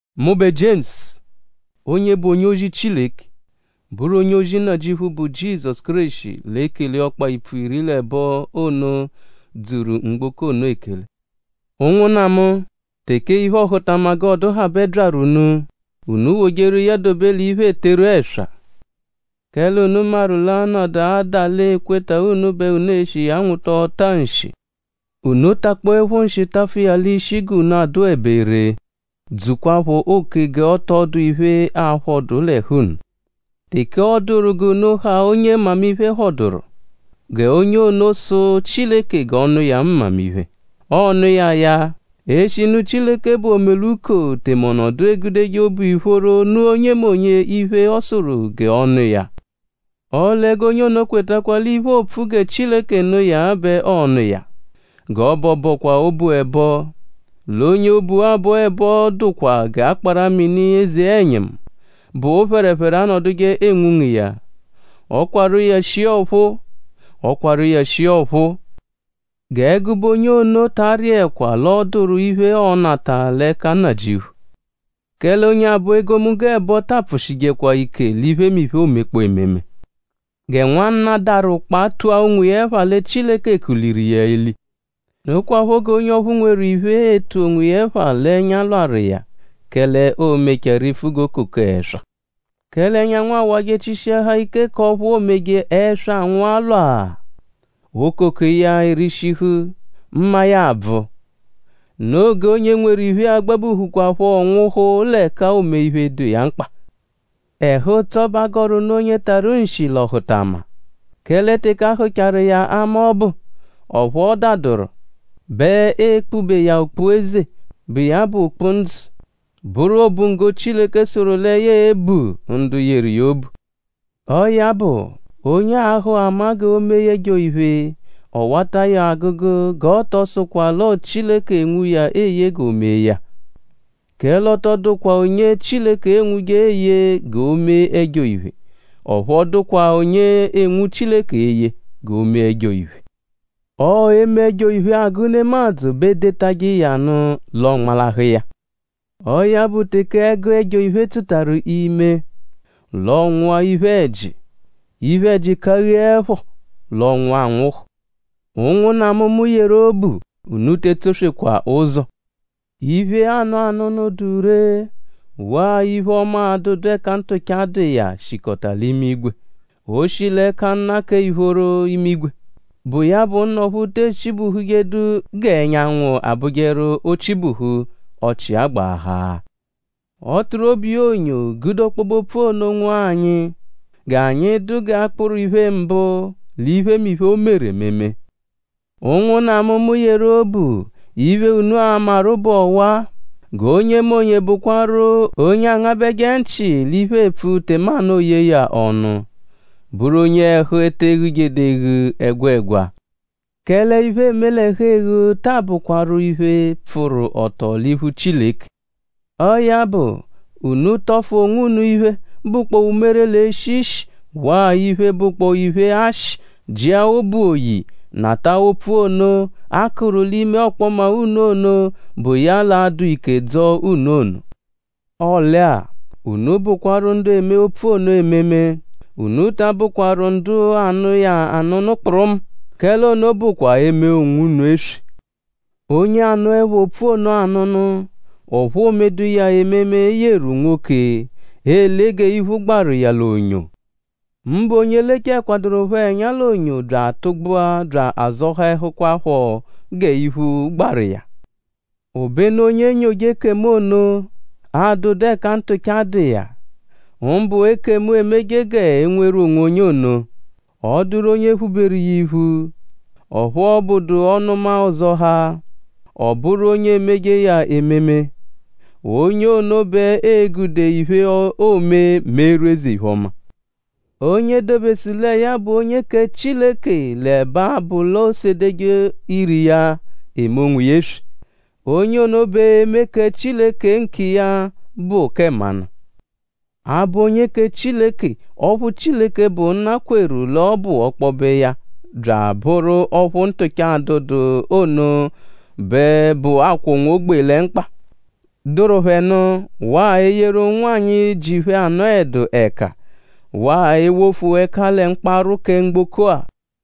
Mụbe Jiemusu, onye bụ onye-ozi Chileke; bụru onye-ozi Nnajịuphu, bụ Jizọsu Kéreshi l'ekele ọkpa-ipfu iri l'ẹbo ono, dzuru mgboko ono ekele. Ụnwunna mu; teke iphe-ọhutama g'ọ dụhabe byaru unu; unu wojeru iya dobe l'iphe, eeteru ẹswa. Kẹle unu maru l'a -nọdu adale ekweta unu bẹ unu e-shi iya nwụta ọta-nshi. Unu takpọepho nshi tafụ iya l'ishi g'unu a-dụebe ree; dzukwaphọ oke g'ọ tọ dụ iphe, a-phọdu l'ẹhu unu. Teke ọ dụru g'unu ha onye mmamiphe phọduru; g'onye ono sụ Chileke g'ọ nụ iya mmamiphe. Ọo-nụ iya ya; eshinu Chileke bụ omeluko; tẹme ọ nọdu egudeje obu ìphóró nụ onyemonye iphe, ọ sụru g'ọ nụ iya. Ọle g'onye ono kwetakwa l'iphe oopfu gẹ Chileke nụ iya bẹ ọo-nụ iya. G'ọ bọ bọkwa obu ẹbo; l'onye obu abọ ẹbo dụkwa g'akpara-mini eze-ẹnyimu, bụ phẹrephere anọduje enwunga iya. Ọ -kwarụ iya shia ọphuu; ọ kwarụ iya shia ọphuu. G'ẹgube onye ono ta arịekwa l'ọ dụru iphe, ọo-nata l'ẹka Nnajịuphu; kẹle onye abọ egomunggo ẹbo ta apfụshijekwa ike l'iphemiphe, oomekpọo ememe. Gẹ nwanna, daru ụkpa tua onwiya ẹpha lẹ Chileke kuliru iya eli. Nokwaphọ g'onye ọphu nweru iphe e-tu onwiya ẹpha l'ẹnya lwarụ iya; kẹle oo-mechaa rifu g'okoko ẹswa; kẹle ẹnyanwu awajẹ chishiahaa ike k'ọphu oomeje ẹswa anwụa lwaa; okoko iya erishihu; mma iya abvụ. Noo g'onye nweru iphe a-gbabuhukwaphọ nwụhu l'ẹka oome iphe, dụ iya mkpa. Ẹhu-ụtso bẹ a gọru nụ onye tarụ nshi l'ọhutama; kẹle teke a hụcharu iya ama ọbu; ọphu ọ daduru bẹ ee-kpube iya okpu-eze, bụ iya bụ ndzụ; bụru obunggo, Chileke sụru lẹ ya e-bu ndu yeru iya obu. Ọo ya bụ; onye aahụ ama g'o mee ẹjo-iphe; ọ -wata iya agụgu; g'ọ tọ sụkwa l'ọo Chileke enwu iya eye g'o mee ya. Kẹle ọ tọ dụkwa onye Chileke enwuje eye g'o mee ẹjo-iphe; ọphu ọ dụkwa onye enwu Chileke eye g'o mee ẹjo-iphe. Ọo eme ẹjo-iphe, agụ nemadzụ bẹ edetajẹ iya nụ; l'ọ nmalahụ iya. Ọo ya bụ; teke ẹgu ẹjo-iphe tsụtaru ime; l'ọonwua iphe-ẹji; iphe-ẹji kagheẹpho; l'ọonwua anwụhu. Ụnwunna mu, mu yeru obu; unu te etsoswekwa ụzo. Iphe, aanụ anụnu, dụ ree waa iphe-ọma, adụdu ẹka ntụcha dụ iya shikọta l'imigwe. O shi l'ẹka Nna kẹ ìphóró imigwe, bụ iya bụ Nna ọphu te echibuhujedu g'ẹnyanwu abụjeru o -chibuhu; ọchi agbaahaa-a. Ọ tụru obu iya onyo gude ọkpobe-opfu ono nwụa anyi; g'anyi dụ g'akpụru iphe-mbụ l'iphemiphe, o meru ememe. Ụnwunna mu, mu yeru obu; iphe, unu a-maru bụ ọwa-a: g'onyemonye bụkwaru onye angabẹje nchị l'iphe, eepfu tẹmanu ooyee ya ọnu; bụru onye ẹhu te eghujedu eghu ẹgwegwa; kẹle iphe, eeme l'ẹhu-eghu taa bụkwaru iphe, pfụru ọto l'iphu Chileke. Ọo ya bụ; unu tọfu onwunu iphe, bụkpoo umere, l'eshi ishi; waa iphe, bụkpoo iphe-ashị; jia obu oyi; nata opfu ono, a kụru l'ime ọkpoma unu ono, bụ iya l'a-dụ ike dzọo unu ono. Ọle-a; unu bụkwaru ndu eme opfu ono ememe. Unu ta abụkwaru ndu anụ iya anụnu kpụrumu; kẹle ono bụkwa eme onwunu eswe. Onye anụepho opfu ono anụnu; ọphu oomedu iya ememe yeru nwoke, ele g'iphu gbaru iya l'onyo. Mbụ onye lechaẹkwadurupho ẹnya l'onyo bya atụgbua bya azọhaehukwapho g'iphu gbaru iya. Obenu onye enyoje ekemu ono, adụdu ẹka ntụcha dụ iya; mbụ ekemu, emeje g'e nweru onwonye ono; ọ -dụru onye phuberu iya iphu; ọphu ọ bụdu ọnuma-ọzohaa; ọ -bụru onye emeje iya ememe; onye ono bẹ ee-gude iphe, oome meeru eze-iphe-ọma. Onye dobesu lẹ ya bụ onye kẹ Chileke l'ẹbe abụ l'oosedeje ire iya eme onwiya eswe. Onye ono bẹ eme kẹ Chileke nkiya bụ kẹ mmanụ. Abụ onye kẹ Chileke ọphu Chileke, bụ Nna kweru l'ọ bụ ọkpobe iya bya abụru ọphu ntụcha adụdu ono bẹ bụ akwọ unwogbee lẹ mkpa, dụru phẹ nụ; waa eyeru ụnwanyi, ji phẹ anọhedu ẹka; waa ewofu ẹka lẹ mkparwụ kẹ mgboko-a.